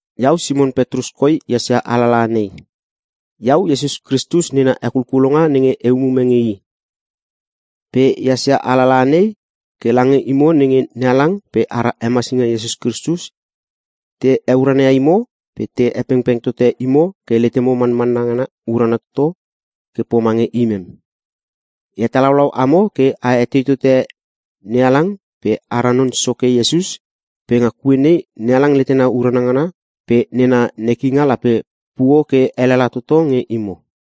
Iau Simon Petrus koi ehas ia alalaha nei. Iau Iesus Kristus nena hekulkulonga nenge e umume nge i. Pe ehas ia alalaha nei ke lange imo nenge NeHalang pe ara Hemasinga Iesus Kristus te heurana ia imo pe te hepengpeng tote imo ke letemo manmanna ngana urana toto ke pomange imem. E hatalaulau amo ke a etei tote NeHalang pe ara Non Soke Iesus pe nga kue nei NeHalang letena urana ngana pe nena nekinga lape puo ke elela toto nge imo.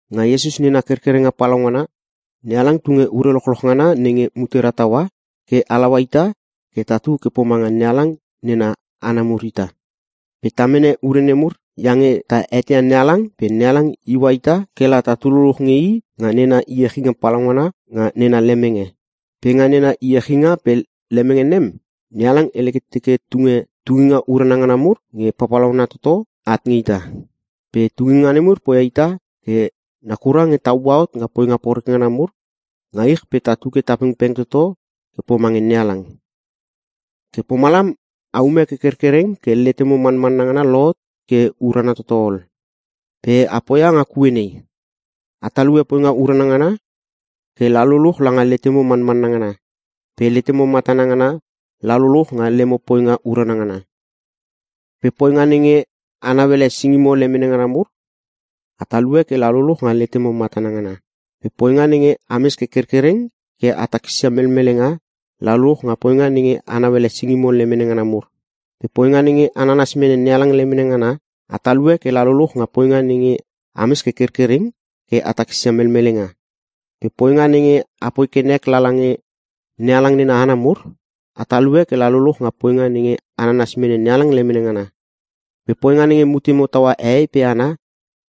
Nga Iesus nena kerkerenga palaungana, NeHalang tunge ure lochloch ngana nenge mutera taua ke halaua ita ke tatu ke pomanga NeHalang nena hana mur ita. Pe ta mene ure nemur iange ta eteia NeHalang pe NeHalang iua ita ke la tatu luluch nge i nga nena iechinga palaungana nga nena lemenge. Pe nga nena iechinga pe lemenge nem, NeHalang hele ke teke tunge tunginga urana ngana mur nge papalauna toto at nge ita. Pe tunginga nemur poia ita ke nakura nge ta ua hot nga poinga poreke ngana mur nga ich pe tatu ke ta pengpeng toto ke pomange NeHalang. Ke pomalam aume ke kerkereng ke letemo manmanna ngana lohot ke urana toto ol. Pe a poia nga kue nei: A talue poinga urana ngana ke la luluch langa letemo manmanna ngana, pe letemo matana ngana la luluch nga lemo poinga urana ngana. Pe poinga nenge a nauele singimo lemene ngana mur, a talue ke la luluch nga letemo matana ngana, pe poinga nenge ames ke kerkereng ke a takisia melmelenga, la luluch nga poinga nenge a nauele singimo lemene ngana mur. Pe poinga nenge a nanas mene NeHalang lemene ngana, a talue ke la luluch nga poinga nenge ames ke kerkereng ke a takisia melmelenga. Pe poinga nenge apoi ke nek lala nge NeHalang nena hana mur, a talue ke la luluch nga poinga nenge a nanas mene NeHalang lemene ngana, pe poinga nenge mutemo taua hehei pe hana,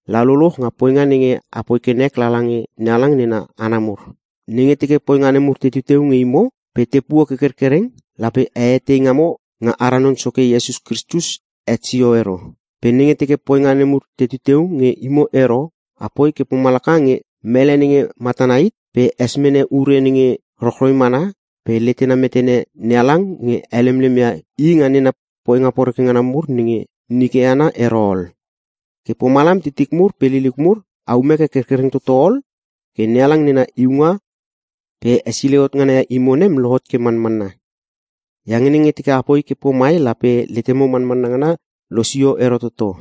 la luluch nga poinga nenge apoi ke nek lala nge NeHalang nena hana mur. Nenge teke poinga nemur tetu teu nge imo pe tepuo ke kerkereng, lape a etei ngamo nga ara Non Soke Iesus Kristus het sio ero. Pe nenge teke poinga nemur tetu teu nge imo ero, apoi ke pomalaka nge mele nenge matana hit pe es mene ure nenge rochroi mana pe letena metene NeHalang nge helemlem ia i nga nena poinga poreke ngana mur nenge nike ana ero ol. Ke pomalam titik mur pe liliuk mur, aume ke kerkereng toto ol ke NeHalang nena iunga pe hesilei hot ngana ia imo nem lohot ke manmanna. Iange nenge teke apoi ke pomai lape letemo manmanna ngana losio ero toto.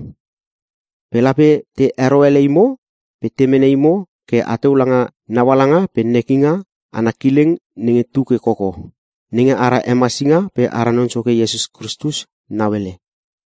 Pe lape te hero ele imo pe te mene imo ke ateu langa naualanga pe nekinga ana kileng nenge tu ke koko, nenge ara Hemasinga pe ara Non Soke Iesus Kristus nauele.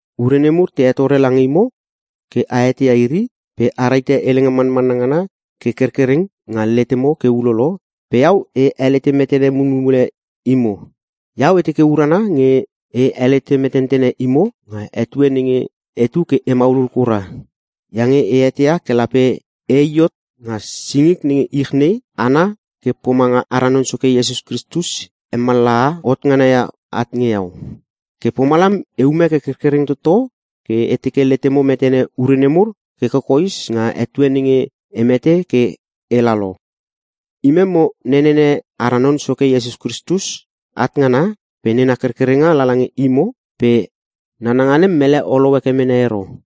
Ure nemur te hetore lange imo ke a eteia iri pe a rahite helenga manmanna ngana ke kerkereng nga letemo ke ulolo pe iau e helete metene mulmule imo. Iau e teke urana nge e helete metentene imo nga etue nenge etu ke e maulul kura, iange e eteia ke lape e i hot nga singik nenge ich nei ana ke pomanga ara Non Soke Iesus Kristus hemallaha hot ngana ia at nge iau. Ke pomalam eume ke kerkereng toto ke e teke letemo metene ure nemur ke kokoes nga etue nenge e mete ke ela lo. Imem mo nenene ara Non Soke Iesus Kristus at ngana pe nena kerkerenga lala nge imo pe nananga nem mele olou heke mene ero.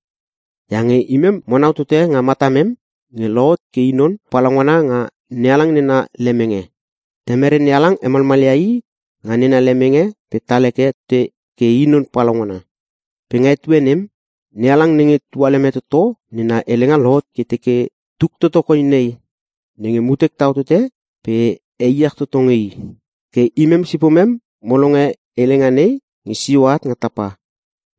Iange imem monau tote nga matamem nge lohot ke i non palaungana nga NeHalang nena lemenge. Temere NeHalang hemalmalia i nga nena lemenge pe tal heke tote ke i non palaungana. Pe nga etue nem, NeHalang nenge tualeme toto, nena helenga lohot ke teke, “Tuk toto koi nei, nenge mutek tau tote pe e iech toto nge I!” Ke imem sipomem mo longe helenga nei nge sio at nga tapa,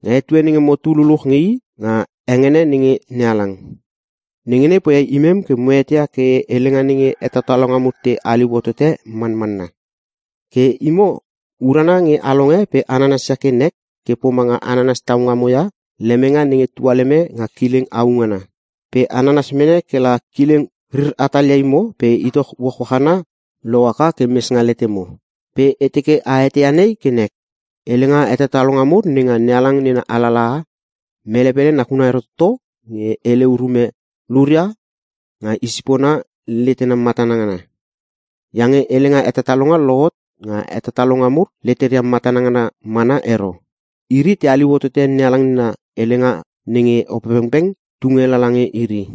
nga etue nenge motu luluch nge i nga hengene nenge NeHalang. Nenge nei poia imem ke mo eteia ke helenga nenge hetatalonga mur te haliu hotote manmanna. Ke imo, urana nge a longe pe a nanasia ke nek ke pomanga a nanas tau ngamo ia lemenge nenge tualeme nga kileng au ngana. Pe a nanas mene ke la Kileng rir hatalia imo pe Itoch uachuach ana lohaka ke mes nga letemo. Pe e teke a eteia nei ke nek: Helenga hetatalonga mur nenga NeHalang nena alalaha, mele pele nakuna ero toto nge hele urume luria nga i sipona letena matana ngana. Iange helenga hetatalonga lohot nga hetatalonga mur leteria matana ngana mana ero. Iri te haliu hotote NeHalang nena helenga nenge Opepengpeng tunge lala nge iri.